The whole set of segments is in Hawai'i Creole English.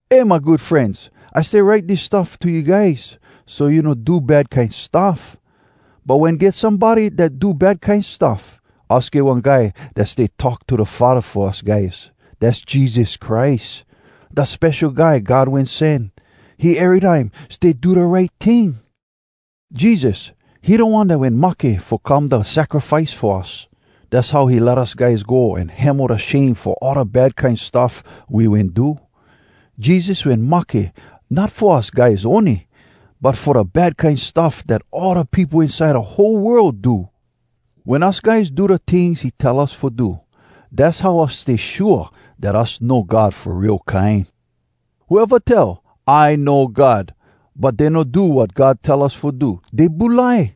Eh, my good frenz! I stay write dis stuff to you guys, so you no do bad kine stuff. But wen get somebody dat do bad kine stuff, us get one Guy dat stay talk to da Faddah fo us guys. Dass Jesus Christ, da Spesho Guy God Wen Sen. He erytime stay do da right ting. Jesus, he da One dat wen mahke fo come da sacrifice fo us. Dass how he let us guys go an hemo da shame fo all da bad kine stuff we wen do. Jesus wen mahke, not fo us guys ony, but fo da bad kine stuff dat all da peopo inside da whole world do. Wen us guys do da tings he tell us fo do, dass how us stay shua dat us know God fo real kine. Whoeva tell “I know God,” but dey no do wat God tell us fo do, dey bulai.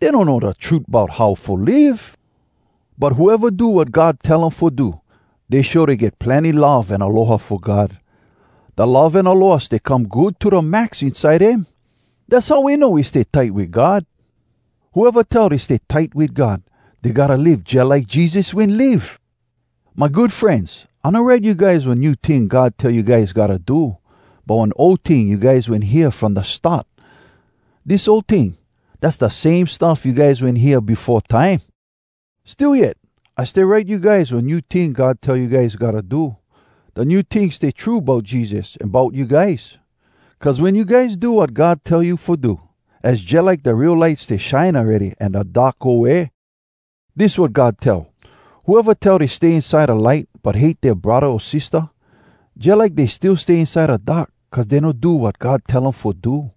Dey donno da trut bout how fo live. But whoeva do wat God tell um fo do, dey show dey get plenny love an aloha fo God. Da love an aloha stay come good to da max inside dem. Dass how we know we stay tight wit God. Whoeva tell dey stay tight wit God, dey gotta live jalike Jesus wen live! My good frenz, I no write you guys one new ting God tell you guys gotta do, but one ol ting you guys wen hear from da start. Dis ol ting, dass da same stuff you guys wen hear befo time. Still yet, I stay write you guys one new ting God tell you guys gotta do. Da new ting stay true bout Jesus an bout you guys. Cuz wen you guys do wat God tell you fo do, az jalike da real light stay shine awready an da dark go way. Dis wat God tell: whoeva tell dey stay inside da light, but hate dea braddah o sistah, jalike dey still stay inside da dark cuz dey no do wat God tell um fo do.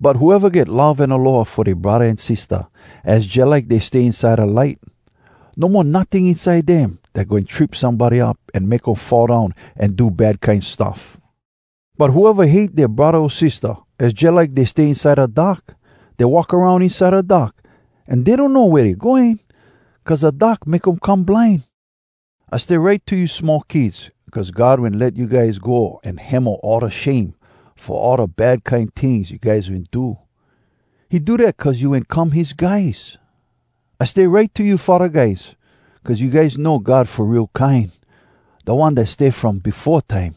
But whoeva get love an aloha fo dea braddah an sistah, az jalike dey stay inside da light. No mo notting inside dem dat goin trip somebody up an make um fall down an do bad kine stuff. But whoeva hate dea braddah o sistah, az jalike dey stay inside da dark. Dey walk aroun inside da dark, an dey donno wea dey going, cuz da dark make um come blind. I stay write to you small kids, Cuz God wen let you guys go An hemo all da shame Fo all da bad kine tings you guys wen do. He do dat cuz you wen come his guys. I stay write to you faddah guys, Cuz you guys know God fo real kine, Da One dat stay from befo time.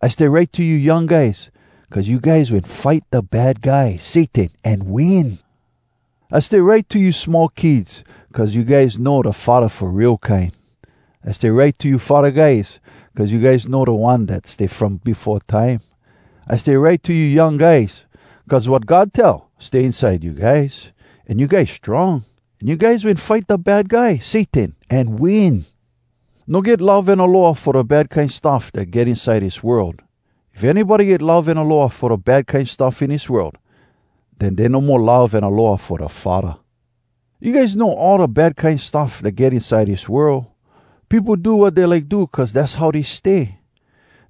I stay write to you young guys, Cuz you guys wen fight da Bad Guy, Satan, an win! I stay write to you small kids Cuz you guys know da Faddah fo real kine. I stay write to you faddah guys, Cuz you guys know da One dat stay from befo time. I stay write to you young guys, Cuz wat God tell stay inside you guys, an you guys strong, An you guys wen fight da Bad Guy, Satan, an win! No get love an aloha fo da bad kine stuff dat get inside dis world. If anybody get love an aloha fo da bad kine stuff in dis world, den dey no mo love an aloha fo da Faddah. You guys know all da bad kine stuff dat get inside dis world: Peopo do wat dey like do cuz dass how dey stay.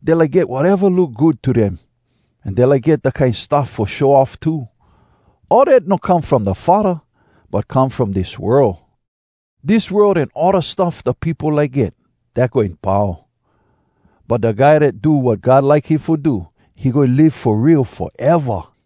Dey like get wateva look good to dem. An dey like get da kine stuff fo show off too. All dat no come from da Faddah, but come from dis world. Dis world an all da stuff da peopo like get, dat goin pau. But da guy dat do wat God like him fo do, he goin live fo real foeva!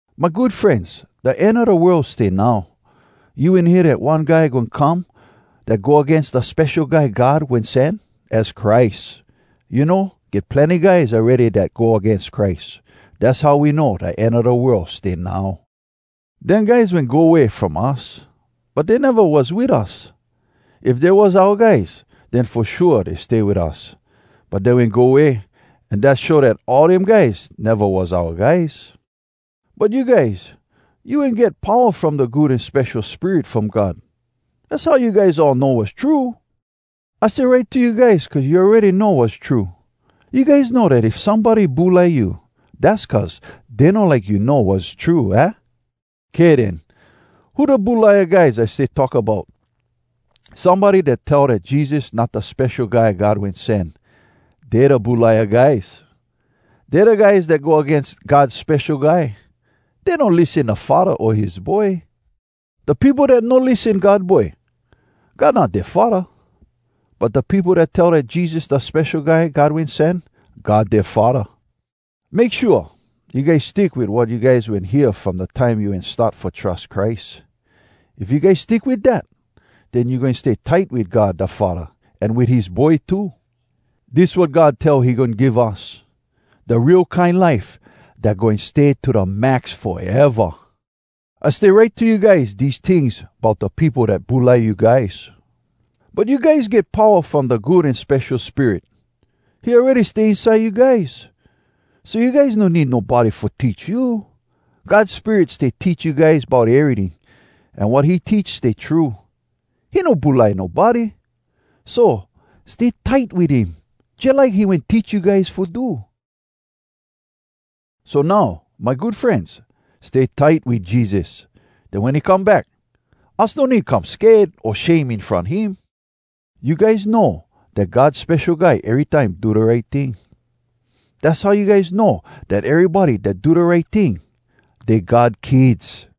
My good frenz, da end a da world stay now. You wen hear dat one guy goin come dat go agains da Spesho Guy God Wen Sen, az Christ. You know, get plenny guys awready dat go agains Christ. Dass how we know da end a da world stay now. Dem guys wen go way from us, but dey neva was wit us. If dey was oua guys, den fo shua dey stay wit us. But dey wen go way, an dat show dat all dem guys neva was oua guys. But you guys, you wen get powa from da Good An Spesho Spirit from God. Az how you guys all know wass true. I stay write to you guys cuz you awready know wass true. You guys know dat if somebody bulai you, dass cuz dey no like you know wass true, aah? Kay den. Who da bulaia guys I stay talk bout? Somebody dat tell dat Jesus not da Spesho Guy God Wen Sen, dey da bulaia guys! Dey da guys dat go agains God Spesho Guy. Dey no lissen da Faddah o his Boy. Da peopo dat no lissen God Boy, God not dea Faddah. But da peopo dat tell dat Jesus da Spesho Guy God Wen Sen, God dea Faddah! Make shua you guys stick wit wat you guys wen hear from da time you wen start fo trus Christ. If you guys stick wit dat, den you goin stay tight wit God da Faddah an wit his Boy too. Dis wat God tell he goin give us—da real kine life dat goin stay to da max foeva! I stay write to you guys dese tings bout da peopo dat bulai you guys. But you guys get powa from da Good An Spesho Spirit. He awready stay inside you guys, so you guys no need nobody fo teach you. God Spirit stay teach you guys bout eryting, an wat he teach stay true. He no bulai nobody. So, stay tight wit him, jalike he wen teach you guys fo do. So now, my good frenz, stay tight wit Jesus. Den wen he come back, us no need come sked o shame in front him. You guys know dat God Spesho Guy erytime do da right ting. Dass how you guys know dat erybody dat do da right ting, dey God kids.